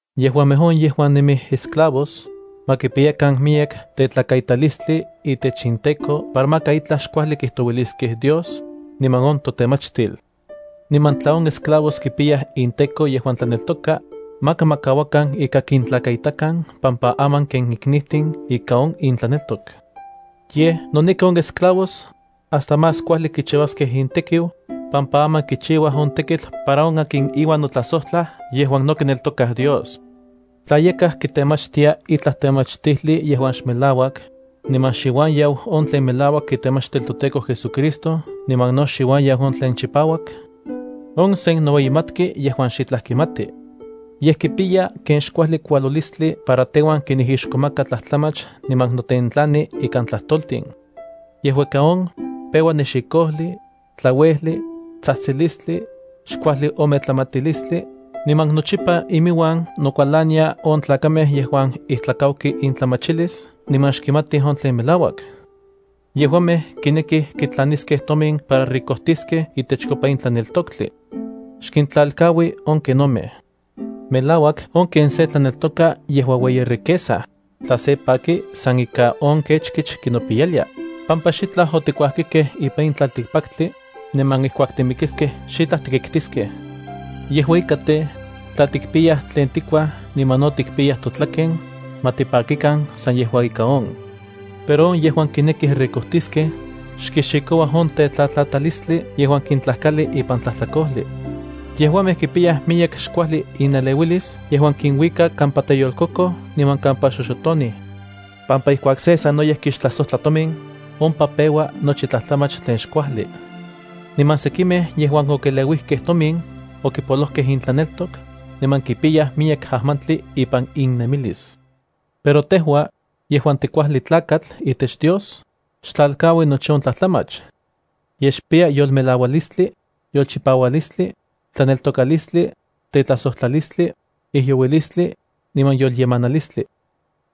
Yejuamej on yejuan nemij esclavos, ma kipiyakan miyek tetlakaitalistli itech inteko para maka itlaj xkuajli kijtouiliskej Dios niman on totemachtil. Niman tla on esclavos kipiyaj inteko yejuan tlaneltokaj, maka ma kauakan ika kintlakaitakan pampa aman ken iknijtin ika on intlaneltok. Yej, noneki on esclavos, hasta más kuajli kichiuaskej intekiu, pampa aman kichiuaj on tekitl para on akin iuan notlajsojtlaj yejuan no kineltokaj Dios. Tla yakaj kitemachtia itlaj temachtijli yejuan xmelauak, niman xiuan yau on tlen melauak itemachtil toTEKO JesuCristo niman no xiuan yau on tlen chipauak, on sen noueyimatki yejuan xitlaj kimati. Yej kipiya ken xkuajli kualolistli para teuan kinijixkomaka tlajtlamach niman notentlani ikan tlajtoltin. Yejua ika on, peua nexikojli, tlauejli, tsajtsilistli, xkuajli ome tlamatilistli, niman nochipa iminuan nokualania on tlakamej yejuan ijtlakauki intlamachilis niman xkimatij on tlen melauak. Yejuamej kinekij kitlaniskej tomin para ricojtiskej itechkopa in tlaneltoktli. Xkintlalkaui on kenomej. Melauak on ken se tlaneltoka yejua ueyi riqueza, tla se paki san ika on kechkich kinopiyalia, pampa xitlaj otikuajkikej ipan in tlaltikpaktli, niman ijkuak timikiskej xitlaj tikitkiskej. Yejua ika tej, tla tikpiyaj tlen tikuaj niman no tikpiyaj totlaken, ma tipakikan san yejua ika on. Pero on yejuan kinekij ricojtiskej, xkixikouaj on tetlatlatalistli yejuan kintlajkali ipan tlajtlakojli. Yejuamej kipiyaj miyek xkuajli ineleuilis yejuan kinuika kampa teyolkokoj niman kampa xoxotonij. Pampa ijkuak se sanoyej kixtlajsojtla tomin, ompa peua nochi tlajtlamach tlen xkuajli. Niman sekimej yejuan okeleuijkej tomin, okipolojkej intlaneltok, niman kipiyaj miyek ajmantli ipan innemilis. Pero tejua, yejuan tikuajli tlakatl itech Dios, xtlalkaui nochi on tlajtlamach. Yej xpiya yolmelaualistli, yolchipaualistli, tlaneltokalistli, tetlajsojtlalistli, ijyouilistli, niman yolyemanilistli.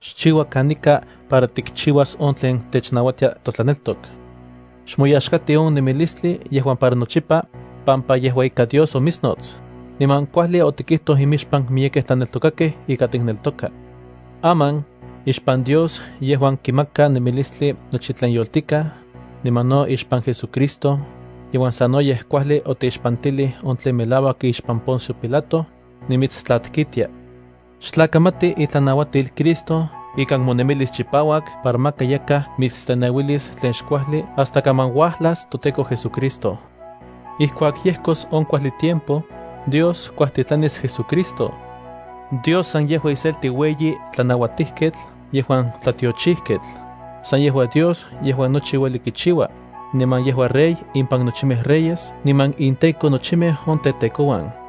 Xchiua kanika para tikchiuas on tlen technauatia totlaneltok. Xmoyaxkati on nemilistli yejuan para nochipa, pampa yejua ika Dios omitsnots, niman kuajli otikijtoj imixpan miyekej tlaneltokakej ika tikneltoka. Aman, ixpan Dios yejuan kimaka nemilistli nochi tlen yoltikaj, niman no ixpan JesuCristo, yejuan sanoyej kuajli oteixpantilij on tlen melauak ixpan Poncio Pilato, nimitstlatkitia: xtlakamati itlanauatil Cristo ikan nemonemilis chipauak para maka yakaj mitsteneuilis tlen xkuajli hasta kaman uajlas toTEKO JesuCristo. Ijkuak yejkos on kuajli tiempo, Dios kuajtitlanis JesuCristo. Dios san yejua iselti ueyi tlanauatijketl yejuan tlatiochijketl, san yejua Dios yejuan nochi ueli kichiua, niman yejua Rey impan nochimej reyes niman inTEKO nochimej on tetekouan.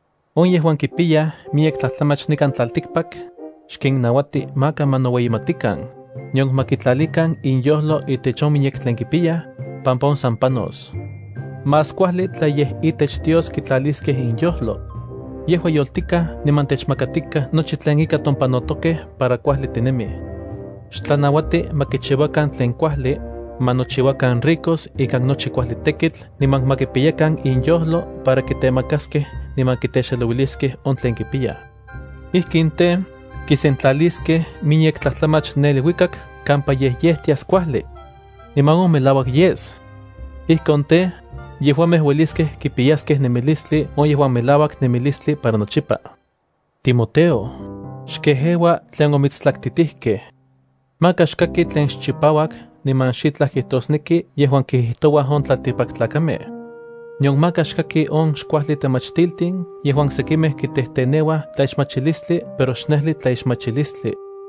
On yejuan kipiyaj miyek tlajtlamach nikan tlaltikpak, xkinnauati maka ma noueyimatikan, nion ma kitlalikan inyojlo itech on miyek tlen kipiyaj, pampa on san panos. Más kuajli tla yej itech Dios kitlaliskej inyojlo. Yejua yoltikaj niman techmakatikaj nochi tlen ika tompanotokej para kuajli tinemij. Xtlanauati ma kichiuakan tlen kuajli, ma nochiuakan ricos ikan nochi kuajli tekitl niman ma kipiyakan inyojlo para kitemakaskej niman kitexelouiliskej on tlen kipiyaj. Ijkin tej, kisentlalijtiaskej miyek tlajtlamach ne iluikak kampa yejyejtias kuajli. Niman on melauak yes. Ijkon tej, yejuamej ueliskej kipiyaskej nemilistli on yejuan melauak nemilistli para nochipa. Timoteo, xkejeua tlen omitstlaktitijkej. Maka xkaki tlen xchipauak niman xitlaj kijtosneki yejuan kijijtouaj on tlaltikpaktlakamej. Nion maka xkaki on xkuajli temachtiltin yejuan sekimej kitejteneuaj tlaixmachilistli pero xnejli tlaixmachilistli.